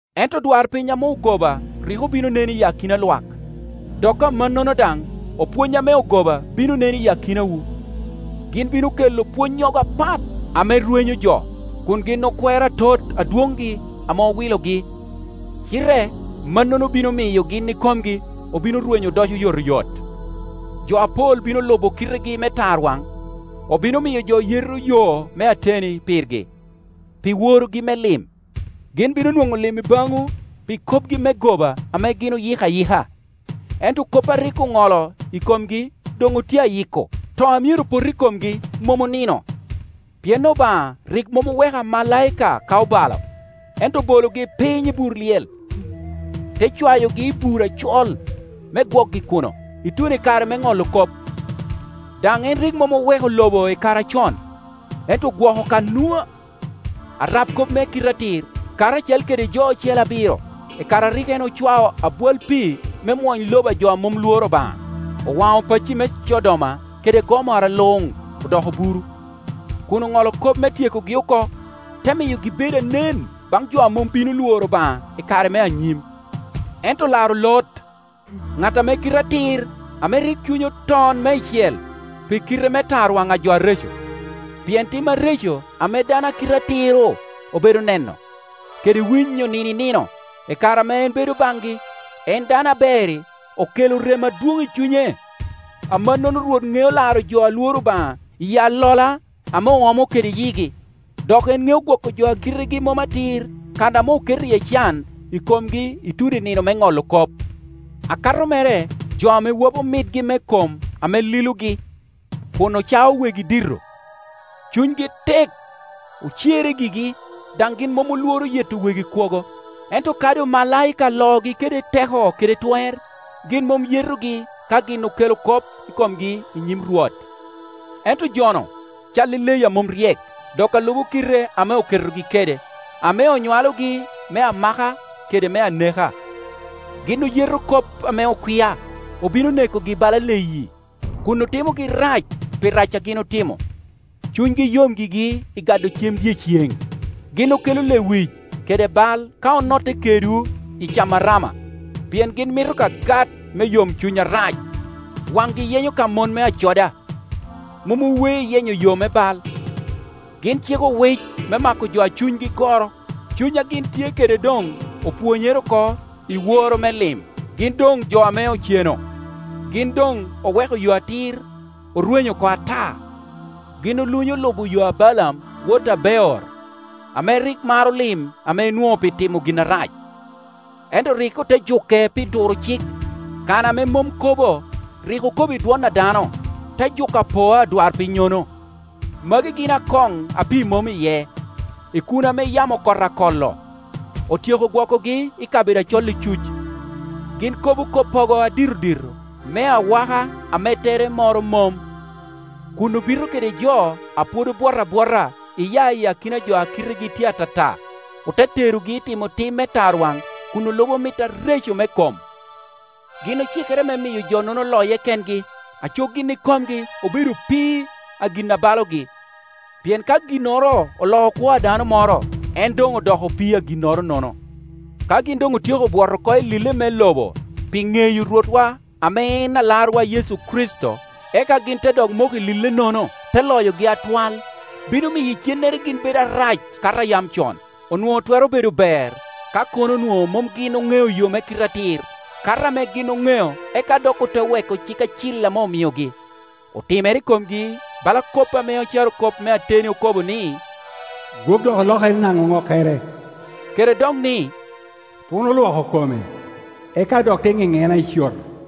Ento odwarpiny ame ogoba rik obin onen i akina lwak, dok amannono daŋ opwony ame ogoba bino nen i akinawu. Gin bino kelo pwonnyogo apat ame rwenyo jo, kun gin okwero atot Adwoŋgi ame owilogi, cite mannono bino miyo gin ikomgi obino rwenyo odoco oyotoyot. Jo apol bino lubo kitegi me tarwaŋ, obino miyo jo yeto yo me ateni pirgi. Pi worogi me lim, gin bino nwoŋo lim i baŋwu pi kopgi me goba ame gin oyiko ayika. Ento kop a rik oŋolo i komgi doŋ otye a yiko, to a myero pot i komgi mom onino. Pien Obaŋa rik mom oweko omalaika ka obalo, ento obologi piny i bur lyel, te cwayogi i bur acol, me gwokgi kuno, ituno i kare me ŋolo kop. Daŋ en rik mom oweko lobo i kare acon, ento ogwoko ka Nua, arab kop me kite atir, karacel kede jo ocele abiro, i kare a rik en ocwao abwal pii me mwony lobo a jo a mom lworo Obaŋa. Owaŋo pacci me Codoma kede Gomora luŋ odoko buru, kun oŋolo kop me tyekogi oko, te miyogi bedo anen baŋ jo a mom bino lworo Obaŋa i kare me anyim. Ento olaro Lot, ŋat ame kite atir ame rik cunye oton meicel pi kite me tarwaŋ a jo areco. Pien tim areco ame dano a kite atir-ru obedo neno kede winyo nino i nino, i kare ame en bedo baŋgi, en dano aber-ri, okelo rem adwoŋ i cunye. Amannono Rwot ŋeo laro jo a lworo Obaŋa iyi alola ame oomo kede yigi, dok en ŋeo gwoko jo a kitegi mom atir kan ame oketo iye can i komgi ituno i nino me ŋolo kop, akato mere jo ame wapo mitgi me kom ame lilogi, kun ocao wegi dito. Cunygi tek, ocerre gigi, daŋ gin mom olworo yeto wegi kwogo. Ento kadi omalaika loogi kede teko kede twer, gin mom yetogi ka gin okelo kop i komgi i nyim Rwot. Ento jo-nu cal i leyi a mom ryek, dok a lubo kile ame oketogi kede, ame onywalogi me amaka kede me aneka; gin oyeto kop ame okwia. Obino nekogi bala leyi, kun otimogi rac pi rac a gin otimo. Cunygi yom gigi i gado cem dyeceŋ. Gin okelo lewic kede bal ka onotte kedwu i camo arama, pien gin mito ka gat me yomcuny arac. Waŋgi yenyo ka mon me acoda, mom owe i yenyo yo me bal. Gin ciko owic me mako jo a cunygi goro. Cuny a gin tye kede doŋ opwonyere oko i woro me lim. Gin doŋ jo ame oceno! Gin doŋ oweko yo atir, orwenyo oko ata. Gin olunyo lubo yo a Balaam wot a Beor, ame rik maro lim ame enwoŋo pi timo gin arac, ento rik ote juke pi turo cik. Kana ame mom kobo, rik okobo i dwon a dano, te juko apoa adwarpinnyono. Magi gin akoŋ a pii mom iye, ikuna ame yamo kot akolo. Otyeko gwokkigi kabedo acol icuc. Gin kobo koppogo aditodito me awaka ame tere moro mom, kun obito kede jo a pwod obwot abwota iya i akina jo a kitegi tye atata, ote terogi i timo tim me tarwaŋ kun olubo mit areco me kom. Gin ocikere me miyo jo-nono loye kengi, aco gin ikomgi obedo opii a gin a balogi; pien ka ginnoro oloo kwo a dano moro, en doŋ odoko opii a ginnoro-nono. Ka gin doŋ otyeko bwot oko i lille me lobo pi ŋeyo Rwotwa ame en Alarwa Yecu Kricito, eka gin te dok moko i lille-nono, te loyogi atwal, bino miyo icennere gin bedo arac kato a yam con. Onwoŋo twero bedo ber ka kono onwoŋo mom gin oŋeo yo me kite atir, kato ame gin oŋeo eka dok ote weko cik acil ame omiogi. Otimere i komgi bala kop ame carokop me ateni okobo ni, “Gwok dok olokere naŋo ŋokkere,” kede dok ni, “Puno olwoko kome, eka dok te ŋeŋena i coto.”